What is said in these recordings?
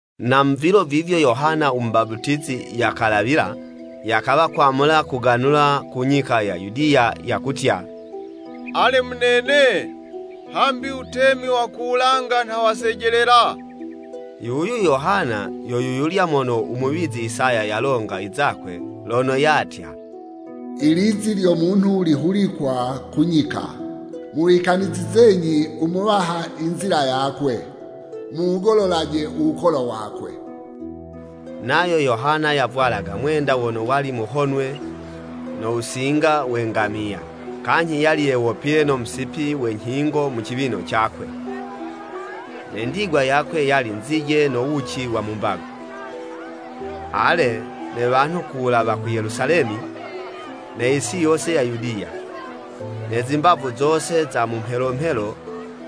Na mu vilo vivyo Yohana u Mubaputizi yakalawila, yakawa kwamula kuganula ku nyika ya Yudiya, yakutya, “Ale munene, hambi u wutemi wa ku wulanga nha wasejelela.” Yuyu Yohana yo yuyulya mono u muwizi Isaya yalonga izakwe, lono yatya, “Ilizi lyo munhu lihulikwa ku nyika, Muwikanizizenyi u Muwaha inzila yakwe, Muwugololaje u wukolo wakwe.” Nayo Yohana yavwalaga mwenda wono wali muhonwe no wusinga we ngamiya, kanyhi yali yewopile no musipi we nyhingo mu ciwino cakwe. Ne ndigwa yakwe yali nzije no wuci wa mu mbago. Ale, ne wanhu ku wulawa ku Yelusalemi, ne yisi yose ya Yudiya, ne zimbavu zose za mu mhelo mhelo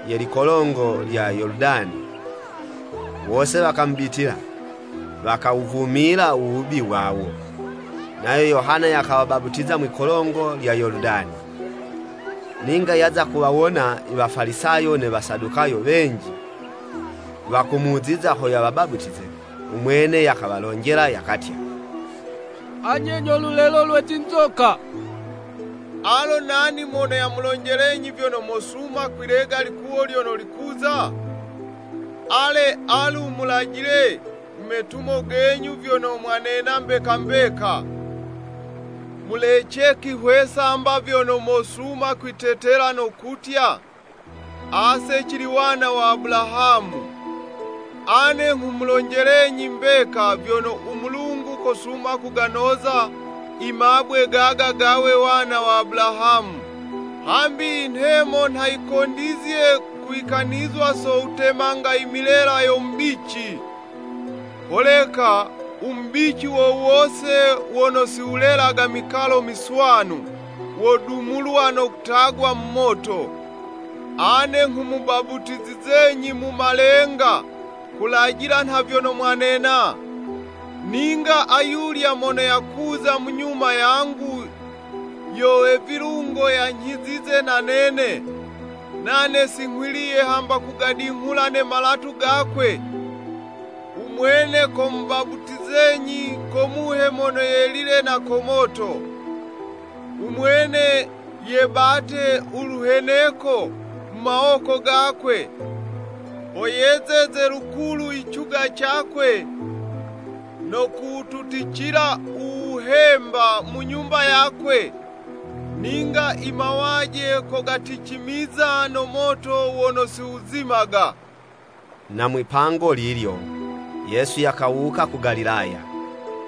ye likolongo lya Yoludani, wose wakamubitila, wakawuvumila u wubi wawo, nayo Yohana yakawabaputiza mwi'kolongo lya Yoludani. Ninga yaza kuwawona i Wafalisayo ne Wasadukayo wenji, wakumuziza ho yawabaputize, u mwene yakawalonjela yakatya, “Anye nyo lulelo lwe zinzoka! Alo nani mono yamulonjelenyi vyono mosuma kwilega ilikuwo lyono likuza?” Ale, alu, mulajile mu metumo genyu, vyono mwanena mbeka mbeka. Mulece kwihwesa 'mba vyono mosuma kwitetela no kutya, “Ase cili wana wa Abulahamu! Ane nghumulonjelenyi mbeka, vyono u Mulungu kosuma kuganoza imabwe gaga gawe wana wa Abulahamu. Hambi inhemo nha yikondizye kuwikanizwa so wutemanga imilela yo mubici, holeka u mubici wo wose wono si wulelaga mikalo miswanu, wodumulwa no kutagwa mu moto. Ane nghumubaputizizenyi mu malenga, kulajila nha vyono mwanena. Ninga ayulya mono yakuza mu nyuma yangu, yo we vilungo yanyhizize na nene. Nane si nghwiliye hamba kugadinghula ne malatu gakwe. U Mwene komubaputizenyi ko Muhe Mono Yelile no ko moto. U mwene yebate u luheneko mu mawoko gakwe, ho yezeze lukulu icuga cakwe, no kuwututicila u wuhemba mu nyumba yakwe, ninga i mawaje kogaticimiza no moto wono si wuzimaga.” Na mwipango lilyo, Yesu yakawuka ku Galilaya,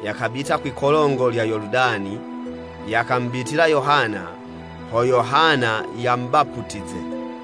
yakabita kwi'kolongo lya Yoludani, yakamubitila Yohana ho Yohana yamubaputize.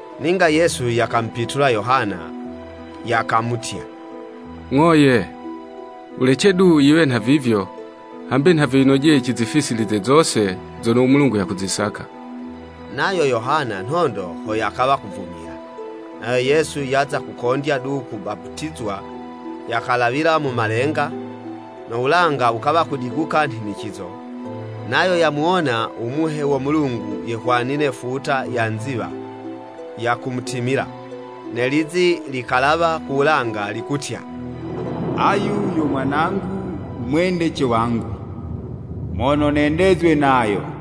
Ninga Yesu yakamupitula Yohana, yakamutya, “Ng'o, ye! Wulece du yiwe nhavivyo, hambi nha vyo yinojeye cizifisilize zose zono u Mulungu yakuzisaka.” Nayo Yohana nhondo ho yakawa kuvumila. Nayo Yesu yaza kukondya du kubaputizwa, yakalawila mu malenga, no wulanga wukawa kudiguka nhinicizo, nayo yamuwona u Muhe wo Mulungu yehwanile futa ya nziwa, yakumutimila. Ne lizi likalawa ku wulanga likutya, “Ayu yo Mwanangu u mwendece wangu, mono nendezwe nayo.”